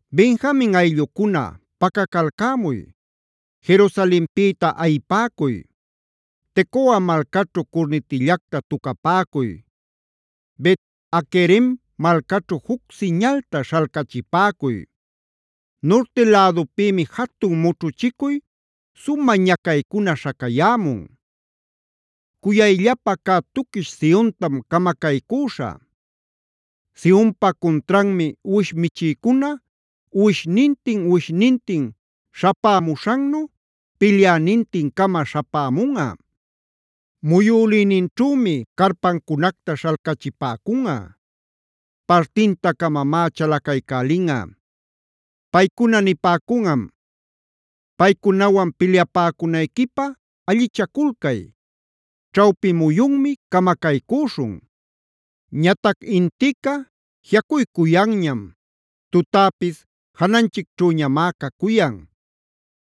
“ ‘Benjamin ayllucuna, pacacalcämuy; Jerusalenpïta ayipäcuy. Tecoa malcaćhu curnitillacta tucapäcuy. Bet-haquerem malcaćhu juc siñalta śhalcachipäcuy. Nurti lädupïmi jatun mućhuchicuy, sumä ñacaycuna śhacayämun. Cuyayllapa cä tuquish Siontam camacaycüśhä; Sionpa cuntranmi uwish michïcuna uwishnintin-uwishnintin śhapämuśhannu pilyänintin-cama śhapämunꞌa. Muyülïninćhümi carpancunacta śhalcachipäcunꞌa; partinta-camamá chalacaycälinꞌa. Paycuna nipäcunꞌam: “Paycunawan pilyapäcunayquipä allichaculcay. Ćhawpi muyunmi camacaycüśhun. Ñatac intica jiꞌacuycuyanñam; tutäpis jananchicćhüñamá cacuyan.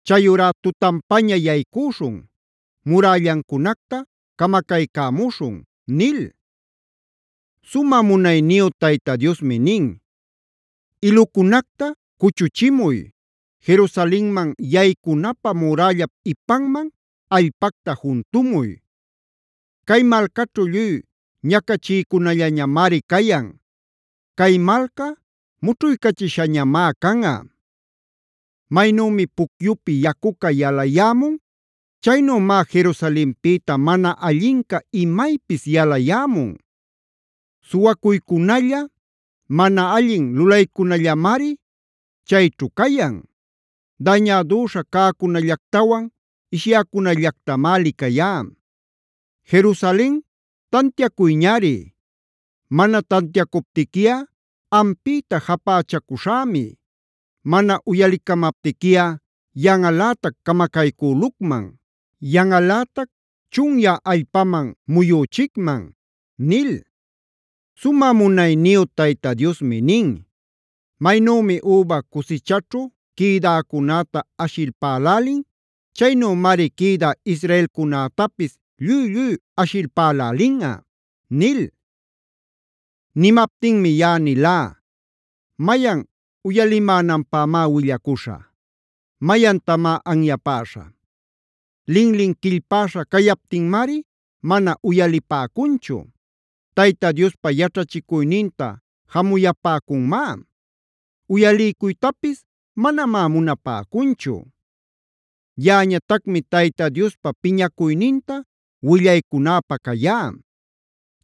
Chayurá tutanpaña yaycüśhun; murällancunacta camacaycämuśhun”’” nil. Sumä munayniyu Tayta Diosmi nin: “Ilucunacta cuchuchimuy; Jerusalenman yaycunapä murällap ipanman allpacta juntumuy. Cay malcaćhu lluy ñacachïcunallañamari cayan; cay malca mućhuycachishañamá canꞌa. Maynümi pucyupi yacuca yalayämun; chaynümá Jerusalenpïta mana allinca imaypis yalayämun. Suwacuycunalla, mana allin lulaycunallamari chayćhu cayan. Dañädüśha cäcunallactawan ishyäcunallactamá licayá. Jerusalen, tantiacuyñari; mana tantiacuptiquiꞌa ampïta japächacuśhämi. Mana uyalicamaptiquiꞌa yanꞌalätac camacaycülucman, yanꞌalätac chunyä allpaman muyüchicman” nil. Sumä munayniyu Tayta Diosmi nin: “Maynümi üba cusichaćhu quïdäcunäta ashipalpälin, chaynümari quïdä israelcunätapis lluy-lluy ashipalpälälinꞌa” nil. Nimaptinmi yaꞌa nilá: “¿Mayan uyalimänanpämá willacuśhä? ¿Mayantamá anyapäśhä? Linlin quillpäśha cayaptinmari mana uyalipäcunchu. Tayta Diospa yaćhachicuyninta jamuyapäcunmá; uyaliycuytapis manamá munapäcunchu. Yaꞌañatacmi Tayta Diospa piñacuyninta willaycunäpä cayá.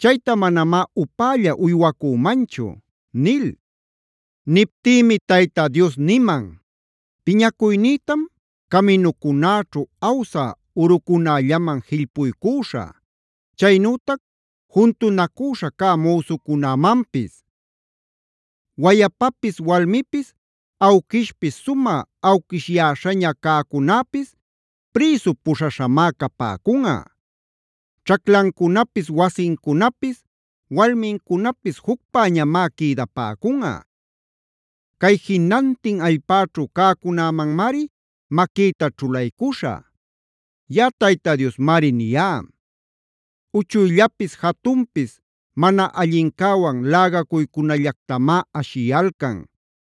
Chayta manamá upälla uywacümanchu” nil. Niptïmi Tayta Dios niman: “Piñacuynïtam caminucunäćhu awsä urucunällaman jillpuycüśhä, chaynütac juntunacüśha cä müsucunämanpis. Wayapapis walmipis, awquishpis sumä awquishyäśhaña cäcunäpis prïsu puśhaśhamá capäcunꞌa. Ćhaclancunapis, wasincunapis, walmincunapis jucpäñamá quïdapäcunꞌa. Cay jinantin allpäćhu cäcunämanmari maquïta ćhulaycuśhä. Yaꞌa Tayta Diosmari niyá. “Uchuyllapis jatunpis mana allincäwan lägacuycunallactamá ashiyalcan.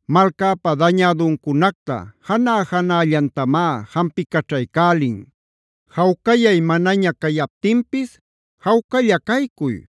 Malcäpa dañäduncunacta janä-janällantamá jampicaćhaycälin. Jawcayay manaña cayaptinpis: ‘Jawcalla caycuy,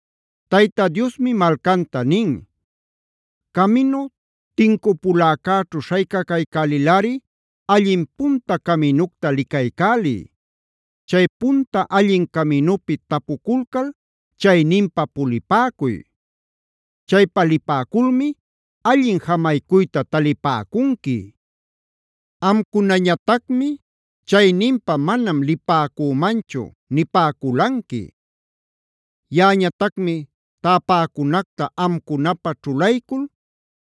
Tayta Diosmi malcanta nin: “Caminu tincupuläcäćhu śhaycacaycälilꞌari, allin punta caminucta licaycäliy. Chay punta allin caminupi tapuculcal chayninpä pulipäcuy. Chaypa lipäculmi allin jamaycuyta talipäcunqui.c Amcunañatacmi: ‘Chayninpa manam lipäcümanchu’ nipäculanqui. “Yaꞌañatacmi täpäcunacta amcunapä ćhulaycul: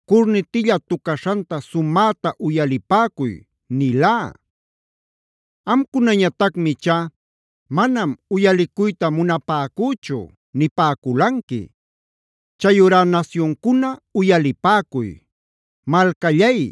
‘Curnitilla tucaśhanta sumäta uyalipäcuy’ nilá. Amcunañatacmi ichá: ‘Manam uyalicuyta munapäcüchu’ nipäculanqui. “Chayurá nasyuncuna uyalipäcuy; malcallay,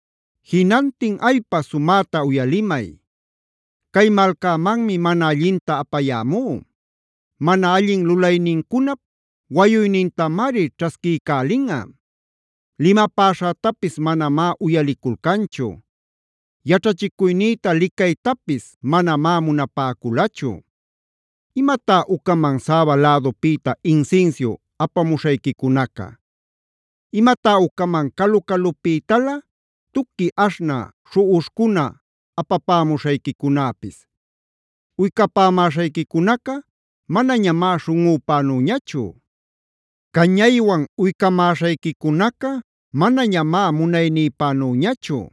Jinantin allpa sumäta uyalimay. Cay malcämanmi mana allinta apayämú; mana allin lulaynincunap wayuynintamari ćhasquiycälinꞌa. Limapäśhätapis manamá uyaliculcanchu; yaćhachicuynïta licaytapis manamá munapäculachu. ¿Imatá ucaman Saba lädupïta insinsiu apamuśhayquicunaca? ¿Imatá ucaman calu-calupïtalä tuqui aśhnä śhuꞌuśhcuna apapämuśhayquicunäpis? Uycapämäśhayquicunaca manañamá śhunꞌüpänüñachu; cañaywan uycamäśhayquicunaca manañamá munaynïpänüñachu.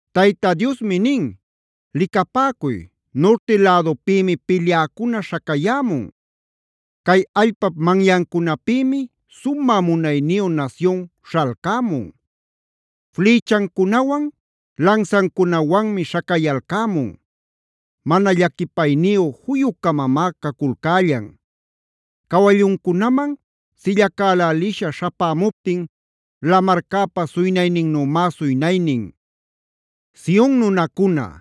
Tayta Diosmi nin: “Licapäcuy, nurti lädupïmi pilyäcuna śhacayämun. Cay allpap manyancunapïmi sumä munayniyu nasyun śhalcämun. Flïchancunawan, lansancunawanmi śhacayalcämun. Mana llaquipayniyu juyu-camamá caculcällan. Cawalluncunaman sillacälälisha śhapämuptin lamarcäpa suynayninnümá suynaynin. Sion nunacuna,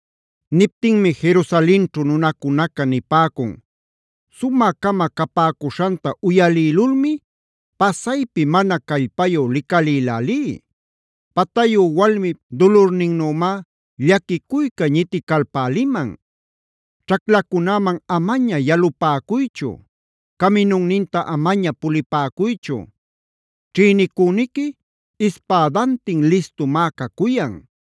Niptinmi Jerusalenćhu nunacunaca nipäcun: “Sumä-cama capäcuśhanta uyalïlulmi pasaypi mana callpayu licalïlälí. Patayu walmip dulurninnümá llaquicuyca ñiticalpäliman. Ćhaclacunäman amaña yalupäcuychu. Caminunninta amaña pulipäcuychu. Ćhïnicüniqui ispädantin listumá cacuyan;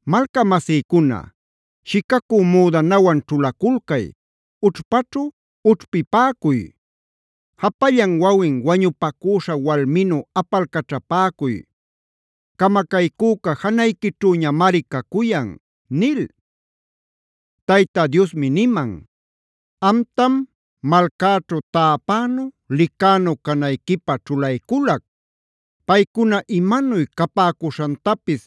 “Malcamasïcuna, shicacü müdanawan ćhulaculcay; ućhpaćhu ućhpipäcuy. Japallan wawin wañupacüśha walminu apalcaćhapäcuy; camacaycüca janayquićhüñamari cacuyan” nil. Tayta Diosmi niman: “Amtam, malcäćhu täpänu, licänu canayquipä ćhulayculac. Paycuna imanuy capäcuśhantapis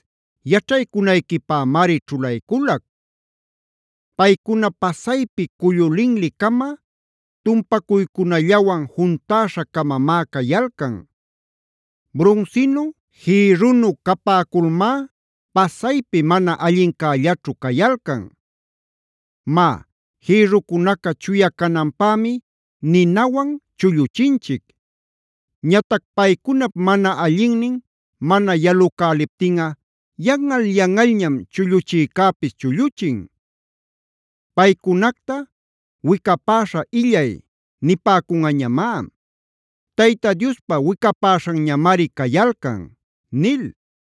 yaćhaycunayquipämari ćhulayculac. Paycuna pasaypi cullu linli-cama, tumpacuycunallawan juntäśha-camamá cayalcan. Brunsinu, jïrrunu capäculmá, pasaypi mana allincällaćhu cayalcan. Má, jïrrucunaca chuya cananpämi ninawan chulluchinchic. Ñatac paycunap mana allinnin mana yalucäliptinꞌa yanꞌal-yanꞌalñam chulluchïcäpis chulluchin. Paycunacta ‘wicapäśha illay’ nipäcunꞌañamá; Tayta Diospa wicapäśhanñamari cayalcan” nil.